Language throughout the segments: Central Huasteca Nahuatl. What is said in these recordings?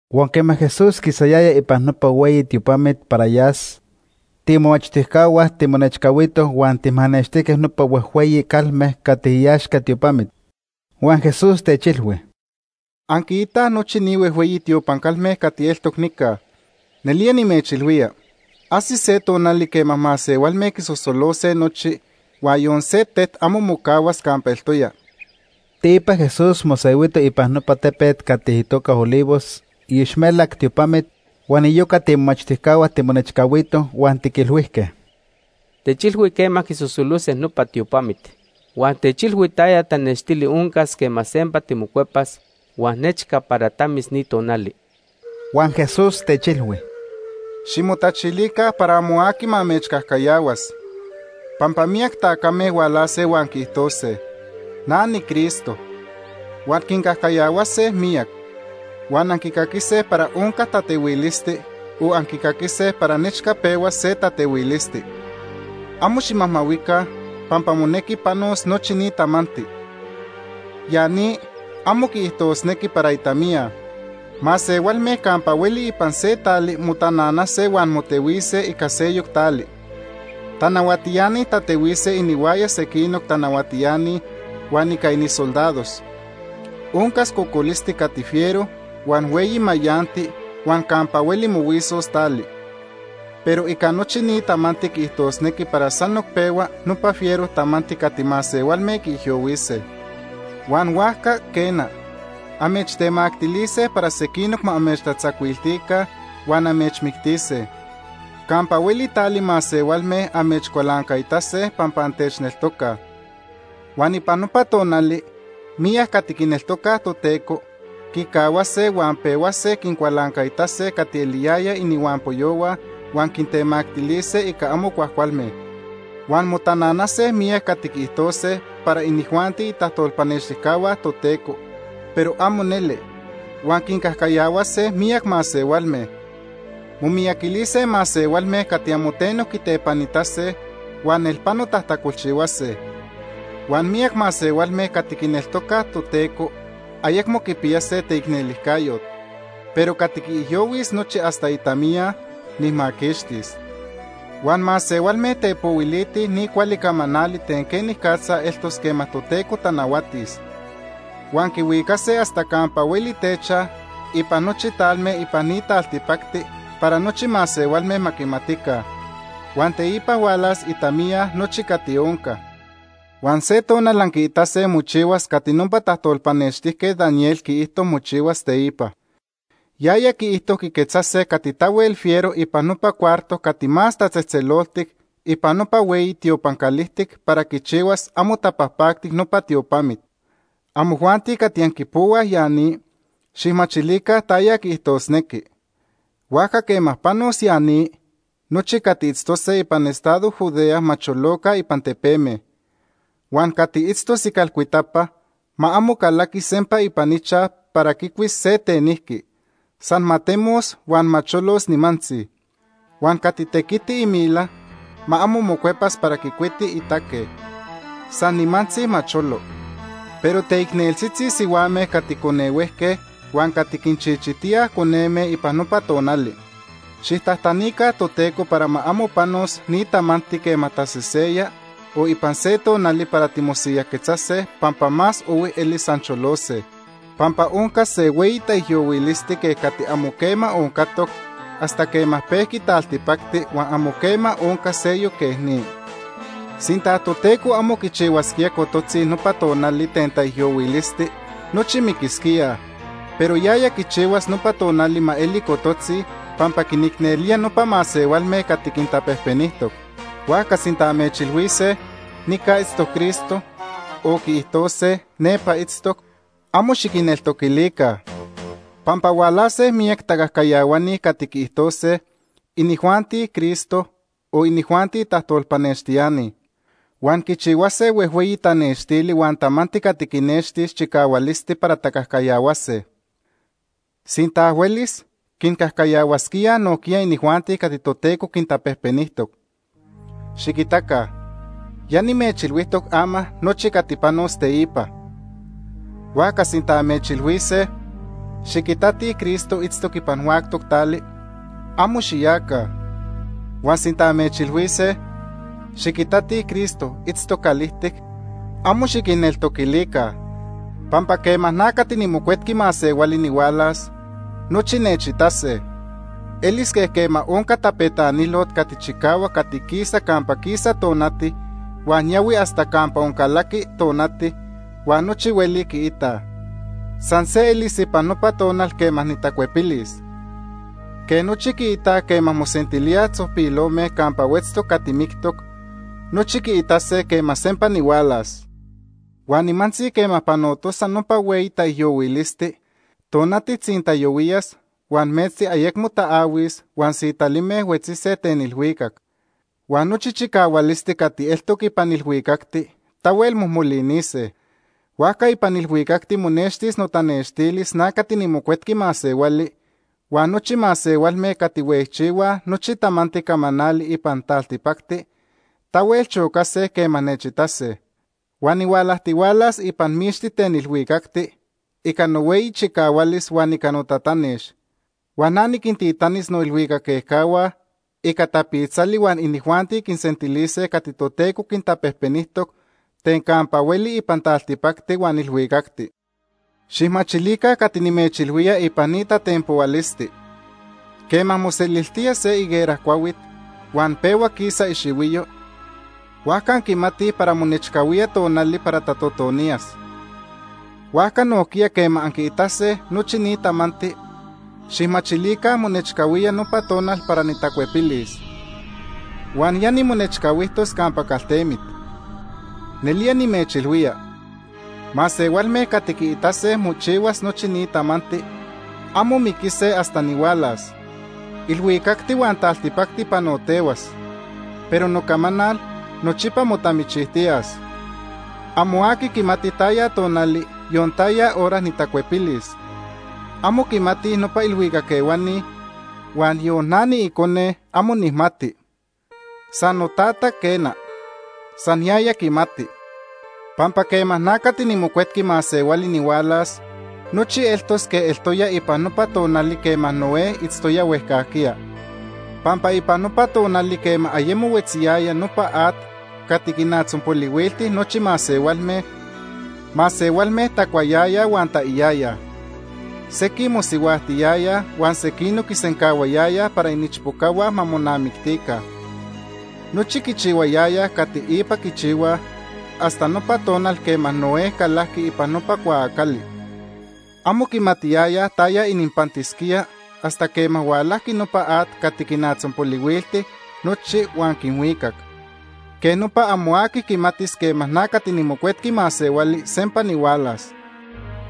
Huan quema Jesús quisayaya ipan nopa hueyi tiopamit para yas, tiimomachtijcahua timonechcahuitoj huan tijmanextijque nopa huejhueyi calme cati iaxca tiopamit. Huan Jesús techilhui: ―Anquiitaj nochi ni huejhueyi tiopan calme cati eltoc nica, nelía nimechilhuía, ajsis se tonali quema masehualme quisosolose nochi, huan yon se tet amo mocahuas campa eltoya. Teipa Jesús mosehuito ipan nopa tepet cati itoca Olivos iixmelac tiopamit, huan iyoca tiimomachtijcahua timonechcahuitoj huan tiquilhuijque: ―Techilhui quema quisosolose nopa tiopamit. Huan techilhui taya tanextili oncas quema sempa timocuepa huan nechca para tamis ni tonali. Huan Jesús techilhui: ―Ximotachilica para amo aqui ma amechcajcayahuas. Pampa miyac tacame hualase huan quiijtose: ‘Na niCristo.’ Huan quincajcayahuase miyac. Huan anquicaquise para onca tatehuilisti o anquicaquise para nechca pehuas se tatehuilisti. Amo ximajmahuica pampa monequi panos nochi ni tamanti. Ya ni amo quiijtosnequi para itamiya. Masehualme campa hueli ipan se tali motananase huan motehuise ica seyoc tali. Tanahuatiani tatehuise inihuaya sequinoc tanahuatiani huan ica inisoldados. Oncas cocolisti cati fiero, huan hueyi mayanti, huan campa hueli mohuisos tali. Pero ica nochi ni tamanti quiijtosnequi para sanoc pehua nopa fiero tamanti cati masehualme quiijyohuise. “Huan huajca, quena, amechtemactilise para sequinoc ma amechtatzacuiltica huan amechmictise. Campa hueli tali masehualme amechcualancaitase pampa antechneltocaj Por notoca.. Huan ipan nopa tonali miyac cati quineltocaj Toteco, quicahuase huan pehuase quincualancaitase cati eliyayaj inihuampoyohua huan quintemactilise ica amo cuajcualme. “Huan motananase miyac cati quiijtose para inijuanti itajtolpanextijcahua Toteco, pero amo neli, huan quincajcayahuase miyac masehualme. Momiyaquilise masehualme cati amo teno quitepanitase huan nelpano tajtacolchihuase. Huan miyac masehualme cati quineltocaj Toteco ayecmo quipiyase teicnelijcayot Pero cati quiijyohuis nochi hasta itamiya, nijmaquixtis. Huan masehualme tepohuilitij ni cuali camanali ten quenicatza eltos quema Toteco tanahuatis, huan quihuicase hasta campa hueli techaj ipan nochi talme ipan ni taltipacti para nochi masehualme ma quimatica. Huan teipa hualas itamiya nochi cati onca. “Huan se tonal anquiitase mochihuas cati nopa tajtolpanextijquet Daniel quiijto mochihuas teipa. Yaya quiijto quiquetzase cati tahuel fiero ipan nopa cuarto cati Más Tatzejtzeloltic ipan nopa hueyi tiopan calijtic para quichihuas amo tapajpactic nopa tiopamit. (Amojuanti cati anquipohuaj ya ni, xijmachilica taya quiijtosnequi.) Huajca quema panos ya ni, nochi cati itztose ipan estado Judea ma choloca ipan tepeme. Huan cati itztos icalcuitapa ma amo calaquis sempa ipan ichaj para quicuis se tenijqui, san ma temos huan ma cholos nimantzi. Huan cati tequiti imila, ma amo mocuepas para quicuiti itaque, san nimantzi ma cholo. ¡Pero teicneltzitzi sihuame cati conehuejque huan cati quinchichitíaj coneme ipan nopa tonali! Xijtajtanica Toteco para ma amo panos ni tamanti quema taseseya o ipan se tonali para timosiyajquetzase pampa más ohui elis ancholose. Pampa oncas se hueyi taijyohuilisti quej cati amo quema oncatoc hasta quema pejqui taltipacti huan amo quema oncas seyoc quej ni. Sinta Toteco amo quichihuasquía cototzi nopa tonali ten taijyohuilisti, nochi miquisquíaj. Pero yaya quichihuas nopa tonali ma eli cototzi pampa quinicnelía nopa masehualme cati quintapejpenijtoc. “Huajca sinta amechilhuise: ‘Nica itztoc Cristo’, o quiijtose: ‘Nepa itztoc’, amo xiquinneltocaca. Pampa hualase miyac tacajcayahuani cati quiijtose inijuanti Cristo, o inijuanti tajtolpanextiani. Huan quichihuase huejhueyi tanextili huan tamanti cati quinextilis chicahualisti para tacajcayahuase. Sinta huelis, quincajcayahuasquíaj nojquiya inijuanti cati Toteco quintapejpenijtoc. Xiquitaca, ya nimechilhuijtoc ama nochi cati panos teipa. “Huajca sinta amechilhuise: ‘Xiquitatij Cristo itztoc ipan huactoc tali’, amo xiyaca. Huan sinta amechilhuise: ‘Xiquitatij Cristo itztoc calijtic’, amo xiquinneltocaca. Pampa quema na cati niMocuetqui Masehuali nihualas, nochi nechitase. Elis quej quema onca tapetanilot cati chicahuac cati quisa campa quisa tonati huan yahui hasta campa oncalaqui tonati huan nochi hueli quiitaj. San se elis ipan nopa tonal quema nitacuepilis. Quej nochi quiitaj quema mosentilíaj tzojpilome campa huetztoc cati mictoc, nochi quiitase quema sempa nihualas. “Huan nimantzi quema panotosa nopa hueyi taijyohuilisti, tonati tzintayohuiyas huan metzti ayecmo taahuis huan sitalime huetzise ten ilhuicac. Huan nochi chicahualisti cati eltoc ipan ilhuicacti tahuel mojmolinise. Huajca ipan ilhuicacti monextis notanextilis na cati niMocuetqui Masehuali, huan nochi masehualme cati huejchihuaj nochi tamanti camanali ipan taltipacti tahuel chocase quema nechitase. Huan nihualajtihualas ipan mixti ten ilhuicacti ica nohueyi chicahualis huan ica notatanex. Huan na niquintitanis noilhuicac ejcahua ica tapitzali huan inijuanti quinsentilise cati Toteco quintapejpenijtoc ten campa hueli ipan taltipacti huan ilhuicacti. “Xijmachilica cati nimechilhuía ipan ni tatenpohualisti. Quema moseliltía se higuera cuahuit, huan pehua quisa ixihuiyo, huajca anquimatij para monechcahuía tonali para tatotoniyas. Huajca nojquiya quema anquiitase nochi ni tamanti, xijmachilica monechcahuía nopa tonal para nitacuepilis. Huan ya nimonechcahuijtos campa caltemit. Nelía nimechilhuía, masehualme cati quiitase mochihuas nochi ni tamanti amo miquise hasta nihualas. Ilhuicacti huan taltipacti panotehuas, pero nocamanal nochipa motamichijtiyas. “Amo aqui quimati taya tonali, yon taya hora nitacuepilis. Amo quimatij nopa ilhuicac ehuani huan yon na niIcone amo nijmati; san noTata, quena. San yaya quimati. “Pampa quema na cati niMocuetqui Masehuali nihualas, nochi eltos quej eltoya ipan nopa tonali quema Noé itztoya huejcajquiya. Pampa ipan nopa tonali quema ayemo huetziyaya nopa at cati quinatzonpolihuilti nochi masehualme, masehualme tacuayayaj huan taiyayaj. Sequij mosihuajtiyayaj huan sequinoc quisencahuayayaj para iniichpocahua ma monamictica. Nochi quichihuayayaj cati ipa quichihuaj hasta nopa tonal quema Noé calajqui ipan nopa cuaacali. Amo quimatiyayaj taya ininpantisquía hasta quema hualajqui nopa at cati quinatzonpolihuilti nochi huan quinhuicac. Quej nopa amo aqui quimatis quema na cati niMocuetqui Masehuali sempa nihualas.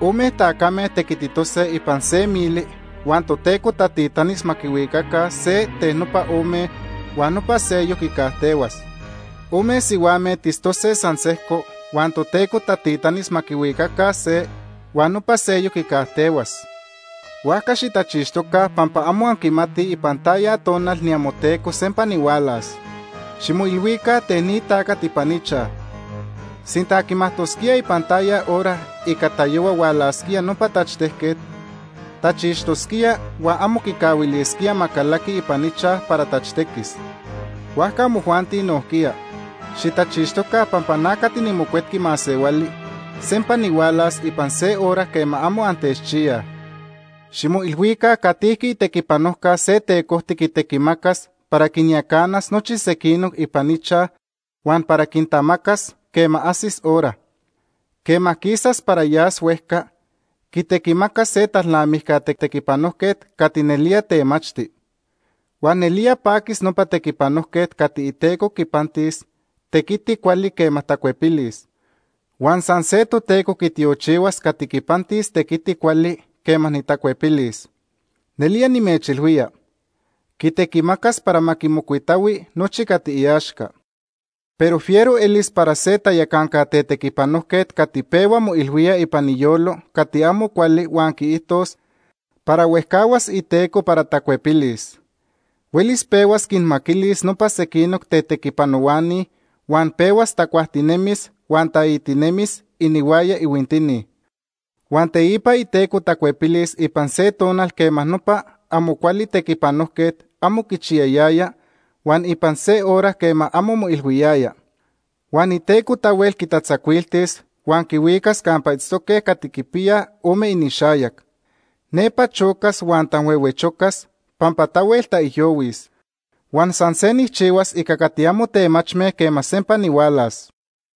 Ome tacame tequititose ipan se mili huan Toteco tatitanis ma quihuicaca se ten nopa ome huan nopa seyoc quicajtehuas. Ome sihuame tistose san sejco huan Toteco tatitanis ma quihuicaca se, huan nopa seyoc quicajtehuas. “Huajca xitachixtoca pampa amo anquimatij ipan taya tonal niamoTeco sempa nihualas. Ximoilhuica ten ni tacat ipan ichaj. Sinta quimajtosquía ipan taya hora ica tayohua hualasquía nopa tachtejquet, tachixtosquía huan amo quicahuilisquía ma calaqui ipan ichaj para tachtequis. Huajca amojuanti nojquiya, xitachixtoca pampa na cati niMocuetqui Masehuali sempa nihualas ipan se hora quema amo antechchiyaj. “Ximoilhuica catijqui itequipanojca se tecojti quitequimacas para quinyacanas nochi sequinoc ipan ichaj huan para quintamacas quema ajsis hora. Quema quisas para yas huejca, quitequimacas se talnamijca tetequipanojquet cati nelía temachti. Huan nelía paquis nopa tequipanojquet cati iteco quipantis tequiti cuali quema tacuepilis, huan san se Toteco quitiochihuas cati quipantis tequiti cuali quema nitacuepilis. Nelía nimechilhuía, quitequimacas para ma quimocuitahui nochi cati iaxca. Pero fiero elis para se tayacanca tetequipanojquet cati pehua moilhuía ipan iyolo cati amo cuali huan quiijtos para huejcahuas iteco para tacuepilis. Huelis pehuas quinmaquilis nopa sequinoc tetequipanohuani huan pehuas tacuajtinemis huan taitinemis inihuaya ihuintini. Huan teipa iteco tacuepilis ipan se tonal quema nopa amo cuali tequipanojquet amo quichiyayaya huan ipan se hora quema amo moilhuiyaya. Huan iteco tahuel quitatzacuiltis huan quihuicas campa itztoque cati quipiyaj ome inixayac. Nepa chocas huan tanhuehuechocas pampa tahuel taijyohuis, huan san se nijchihuas ica cati amo temachme quema sempa nihualas.